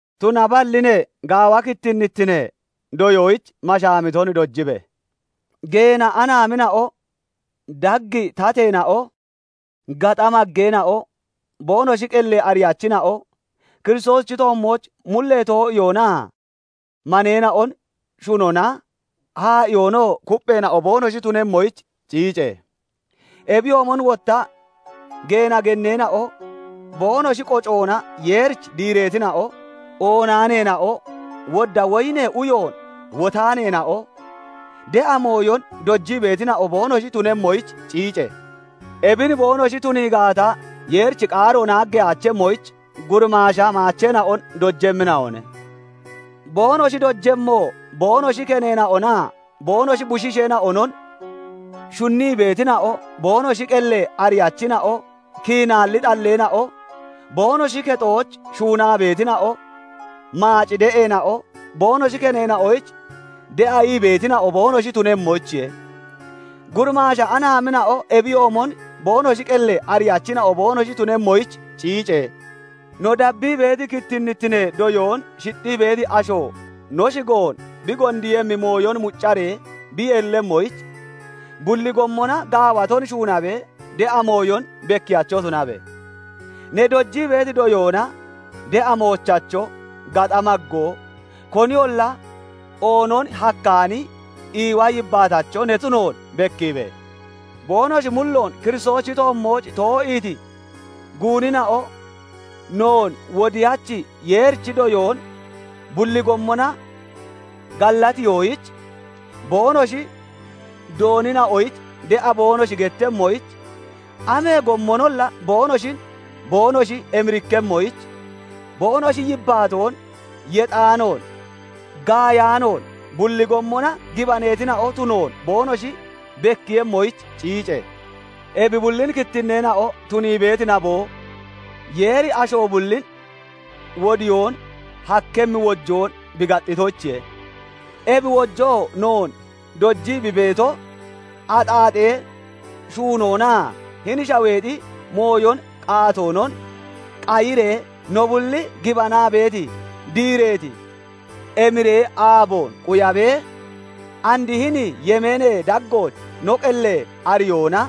Tunaballi ne, gaawa kittinnittinee doyoyich mashaamiton dojibe! Geena anaamina'o dag tateena'o, gaxa maggeena'o, boonoshi qellee ariyachina'o, Kiristoosichi toommooch mullee too'iyoonaa maneena'on shunona, haa'iyoonoo kuppheena'o boonoshi tunemmoyich ciice! Ebiyoomon wotta geena genneena'o boonoshi qocoona Yeerich diireetina'o, oonaaneena'o, wodda woyinee uyoon wotaaneena'o, de'a mooyon dojii beetina'o boonoshi tunemmoyich ciice! Ebin boonoshi tunii gaata, Yeerichi qaaro naaggeyaachemmoyich, gurimaasha maacheena'on dojemmina'one; boonoshi dojemmoo boonoshi keneena'onaa boonoshi bushiisheena'onon shunnii beetina'o, boonoshi qellee ariyachina'o, kiinaalli xalleena'o, boonoshi kexooch shuunaa beetina'o, maaci de'eena'o, boonoshi keneena'oyich de'a ii beetina'o boonoshi tunemmoyichiye. Gurimaasha anaamina'o ebiyoomon boonoshi qellee ariyachina'o boonoshi tunemmoyich ciice! No dabbii beeti kittinnittinee doyoon shixxii beeti asho no shigoon bi gondiiyemmi mooyon muccaree bi yeellemmoyich, bulli gommona gaawaton shuunabee de'a mooyon bekkiyacho tunabe! Ne dojii beeti doyoona de'a moochacho, gaxa maggoo, koniyolla oonon hakkaani iiwa yibbaatacho ne tunoon bekkiibe! Boonoshi mulloon Kiristoosichi toommooch too'iiti guunina'o noon Wodiyachi Yeerichi doyoon bulli gommona gallatiyoyich, boonoshi doonina'oyich de'a boonoshi gettemmoyich, amee gommonolla boonoshin boonoshi emirikkemmoyich, boonoshi yibbaatoon yexaanoon, gaayaanoon, bulli gommona gibaneetina'o tunoon boonoshi bekkiiyemmoyich ciice! Ebi bullin kittinneena'o tunii beeti naboo, Yeeri asho bullin wodiyoon hakkemmi wojoon bi gaxxitoyichiye. Ebi wojoo noon dojii bi beeto, axaaxee shuunoonaa hini shaweexi mooyon qaatoonon qayiree, no bulli gibanaa beeti, diireeti emiree aaboon quyabee, and hini yemeenee daggooch no qellee ariyoona,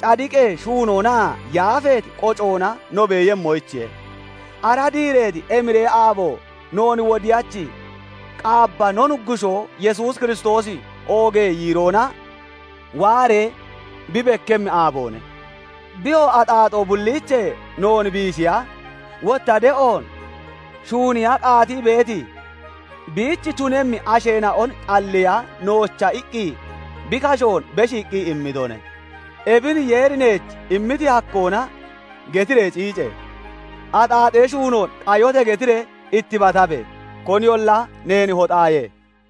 cadiqee shuunoonaa yaafeeti qocoona no beeyemmoyichiye. Ara diireeti emiree aabo noon Wodiyachi Qaabba no Nuggushoo Yesuus Kiristoosi oogee yiiroona waaree bi bekkemmi aaboone. Biyoo axaaxoo bulliichee noon biishiya, wotta de'oon shuuniya qaatii beeti, biich tunemmi asheena'on xalliiya noocha iqqi bi kashoon beshiiqqi immitone. Ebin Yeeri neech immiti hakkoona getiree ciice! "Axaaxee shuunoon qayote!" getiree ittibatabe! Koniyolla neen hoxaaye.